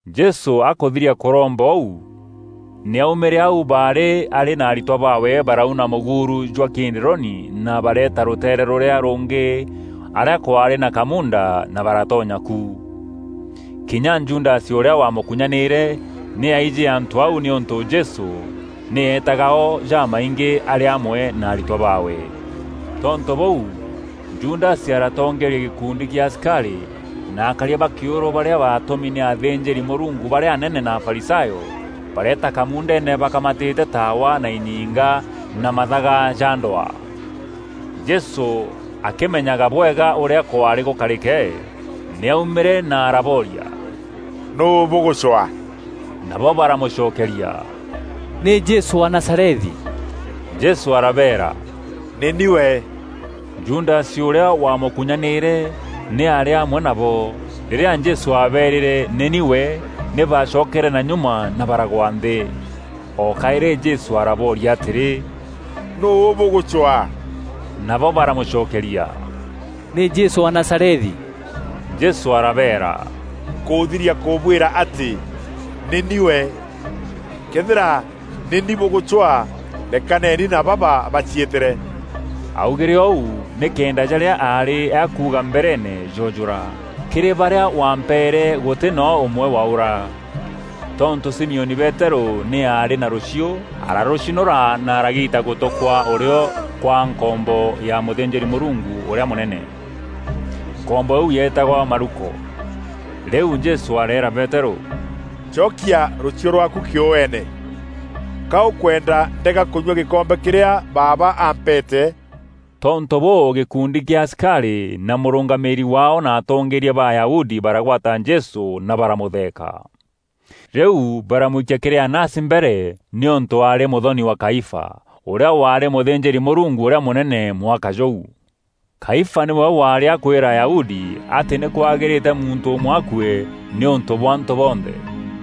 Jesû akûthiria kûromba ûu, nî aumîre aû baarî arî na aritwa baawe baraûna mûguuru jwa Kidironi na bareeta rûteere rûrîa rûngî arîa kwaarî na kamuunda na baratonya ku. Kinya Judasi ûrîa waamûkunyanîîre, nî aijî antû au nîûntû Jesû nî eetaga o jamaingî arî amwe na aritwa baawe. Tontû bûu, Judasi aratongeeria gîkundi kîa asikarî na akaria ba kîûrû barîa baatûmi nî athînjîri-Mûrungu barîa anene na Afarisayo, bareeta kamuundeene bakamatîte taawa na inyinga na mathaga ja ndwaa. Jesû akîmenyaga bwega ûrîa kwaarî gûkarîke, nî aumîîre na arabooria, “Nûû bûgûcwaa?” Nabo baramûcokeeria, “Nî Jesû wa Nazarethi.” Jesû arabeera, “Nî ni we.” Judasi ûrîa waamûkunyanîîre, nî aarî amwe nabo. Rîrîa Jesû aabeerîre, “Nî ni we,” nî bacokere na nyuma na baragwa nthî. O kaîrî Jesû arabooria atîrî, “Nûû bûgûcwaa?” Nabo baramûcokeria, “Nî Jesû wa Nazarethi.” Jesû arabeera, “Nkûthiria kûbwîra atî nî ni we. Këethîra nî ni bûgûcwaa, rekaneni na baba baciîtîre.” Aaugîre ûu nîkenda jarîa aarî akuuga mbereene joojûra, “Kîrî barîa wampeere, gûtî no ûmwe waaûra.” Tontû Simioni Peterû nî aarî na rûchiû, ararûcinûra na aragiita gûtû kwa ûrîo kwa nkombo ya mûthînjîri-Mûrungu ûrîa mûnene. Nkombo îîu yeetagwa Maluko. Rîu Jesû areera Peterû, “Cokia rûchiû rwaaku kîûene. Ka ûkwenda ndega kûnyua gîkombe kîrîa Baaba aampeete.” Tontû bûû gîkundi kîa asikarî na mûrûngamîîri waao na atongeeria ba Ayahudi baragwata Jesû na baramûtheeka. Rîu baramwikia kîrî Anasi mbere nîûntû aarî mûthoni wa Kaifa, ûrîa waarî mûthînjîri-Mûrungu ûrîa mûnene mwaka jûu. Kaifa nîwe waarî akwîra Ayahudi atî nî kwagîrîte muntû ûmwe akue nîûntû bwa antû bonthe.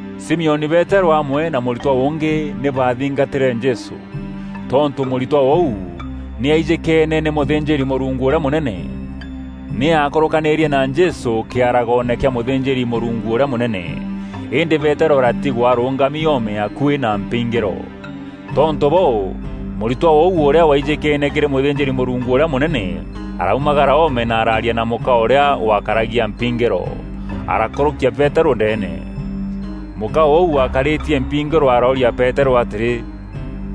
Simioni Peterû amwe na mûritwa ûngî nî baathingatîre Jesû. Tontû mûritwa ûu nî aijîkeene nî mûthînjîri-Mûrungu ûrîa mûnene, nî aakûrûkanîrie na Jesû kîaragoone kîa mûthînjîri-Mûrungu ûrîa mûnene, îndî Peterû aratigwa arûngami oome akuî na mpingîro. Tontû bûû, mûritwa ûu ûrîa waijîkeene kîrî mûthînjîri-Mûrungu ûrîa mûnene araumagara oome na araaria na mûka ûrîa wakaragia mpingîro, arakûrûkia Peterû ndeene. Mûka ûu wakarîtie mpingîro arooria Peterû atîrî,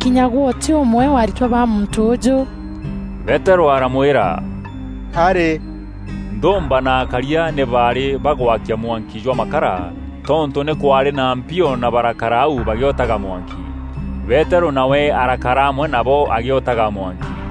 “Kinya gwe ûtî ûmwe wa aritwa ba muntû ûûjû?” Peterû aramwîra, “Arî.” Nthûûmba na akaria nî baarî bagwakia mwanki jwa makara tontû nî kwaarî na mpio na barakara au bagîotaga mwanki. Peterû nawe ararakara amwe nabo agîotaga mwanki.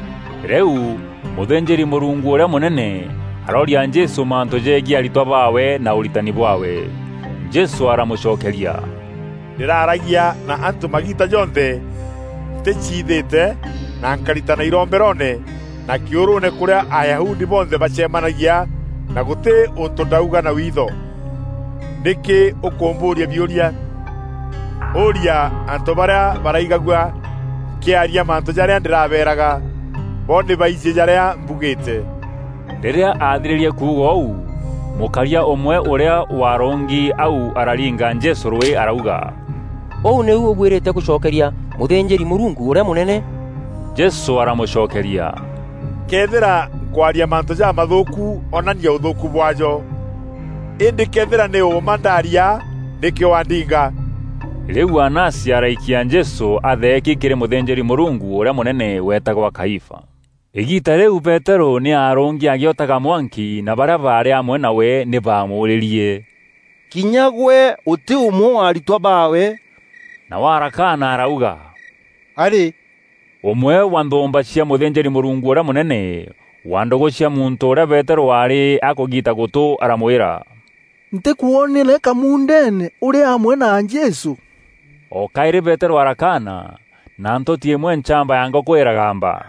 Rîu, mûthînjîri-Mûrungu ûrîa mûnene, arooria Jesû mantû jegiî aritwa baawe na ûritani bwaawe. Jesû aramûcokeria, “Ndîraaragia na antû magiita jonthe nticiithîte na nkaritana iromberoone, na kîûrûûne kûrîa Ayahudi bonthe bacemanagia na gûtî ûntû ndauga na witho. Nîkî ûkûmbûûria biûria? Ûûria antû barîa baraigagua nkîaria mantû jarîa ndîrabeeraga. Bo nî baijî jarîa mbugîîte.” Rîrîa athirîrie kuuga ûu, mûkaria ûmwe ûrîa waarûngi au araringa Jesû rûî arauga, “Ûu nîu ûbuîrîte gûcokeria mûthînjîri-Mûrungu ûrîa mûnene?” Jesû aramûcokeria, “Këethîra nkwaria mantû jamathûûku onania ûthûûkû bwaajo. Îndî këethîra nî ûûma ndaaria, nîkî waandinga?” Rîu Anasi araikia Jesû atheeki kîrî mûthînjîri-Mûrungu ûrîa mûnene weetagwa Kaifa. Îgiita rîu Peterû nî arûngi agîotaga mwanki na barîa baarî amwe nawe nî baamûûrîrie, “Kinya gwe ûtî ûmwe wa aritwa baawe?” Nawe arakaana arauga, “Arî.” Ûmwe wa nthûûmba cia mûthînjîri-Mûrungu ûrîa mûnene wa ndûgû cia muntû ûrîa Peterû aarî akûgiita gûtû aramwîra, “Ntîkwonere kamuundeene ûrî amwe na Jesû?” O kaîrî Peterû arakaana na ntûti îmwe nchamba ya ngûkû îragamba.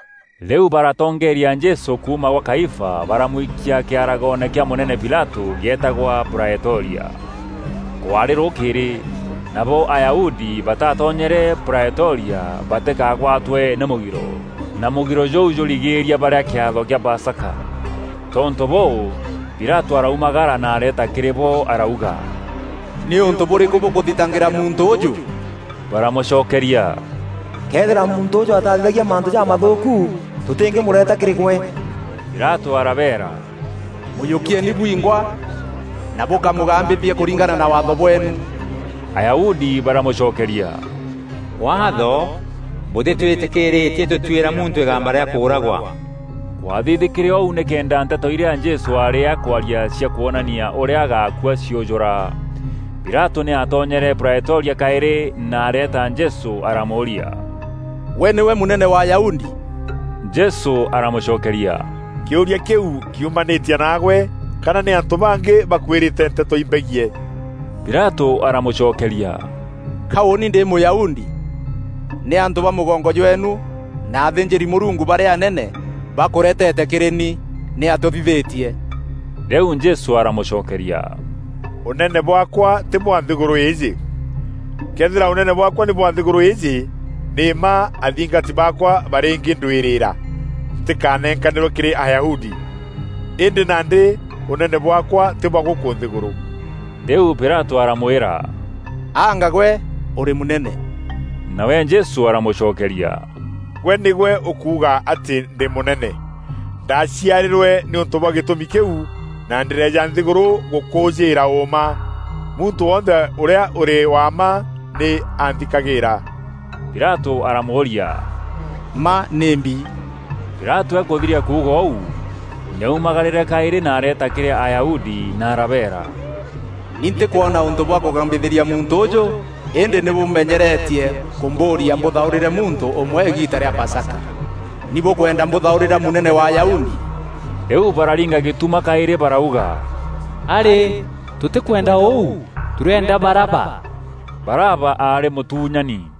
Rîu baratongeeria Jesû kuuma gwa Kaifa baramwikia kîaragoone kîa mûnene Pilatû gîeetagwa Praetoria. Kwarî rûkîîrî, nabo Ayahudi batatonyere Praetoria batîkagwatwe nî mûgiro, na mûgiro jûu jûrigîîria barîa kîatho kîa Pasaka. Tontû bûû, Pilatû araumagara na areeta kîrî bo arauga, “Nî ûntû bûrîkû bûkûthitangîra muntû ûûjû?” Baramûcokeria, “Këethîra muntû ûûjû ataathithagia mantû jamathûûku, tûtîngîmûreeta kîrî gwe.” Pilatû arabeera, “Mûjûkieeni bwingwa na bûkamûgambithie kûringana na Waatho bweenu.” Ayahudi baramûcokeria, “Waatho bûtîtwîtîkîîrîtie tûtuîra muntû îgamba rîa kûûragwa.” Kwathithîkîre ûu nîkenda nteto irîa Jesû aarî akwaria cia kwonania ûrîa agaakua ciûjûra. Pilatû nî aatonyere Praetoria kaîrî na areeta Jesû aramûûria, “Gwe nîgwe mûnene wa Ayahudi?” Jesû aramûcokeria, “Kîûria kîu kiumanîtie naagwe, kana nî antû bangî bakwîrîte nteto imbegiî?” Pilatû aramûcokeria, “Ka ûûni ndî Mûyahudi? Nî antû ba mûgongo jweenu na athînjîri-Mûrungu barîa anene bakûreetete kîrî ni. Nîatîa ûthithîtie?” Rîu Jesû aramûcokeria, “Ûnene bwaakwa tî bwa nthîgûrû îîjî. Këethîra ûnene bwaakwa nî bwa nthîgûrû îîjî, nî mma athingati baakwa barîngîndwîrîîra ntîkanenkanîrwe kîrî Ayahudi. Îndî nandî ûnene bwaakwa tî bwa gûkû nthîgûrû.” Rîu Pilatû aramwîra, “Anga gwe ûrî mûnene?” Nawe Jesû aramûcokeria, “Gwe nîgwe ûkuuga atî ndî mûnene. Ndaaciarîrwe nîûntû bwa gîtûmi kîu na ndîreeja nthîgûrû gûkûûjîîra ûûma. Muntû wonthe ûrîa ûrî wa mma, nî anthikagîîra.” Pilatû aramûûria, “Mma nîmbi?” Pilatû akûthiria kuuga ûu, nî aumagarîre kaîrî na areeta kîrî Ayahudi na arabeera, “Ni ntîkwona ûntû bwa kûgambithîria muntû ûûjû. Îndî nî bûmenyeretie kûmbûûria mbûthaûrîre muntû ûmwe îgiita rîa Pasaka. Nî bûkwenda mbûthaûrîra Mûnene wa Ayahudi?” Rîu bararinga gîtuma kaîrî barauga, “Arî, tûtîkwenda ûu, tûrîenda Baraba!” Baraba aarî mûtuunyani.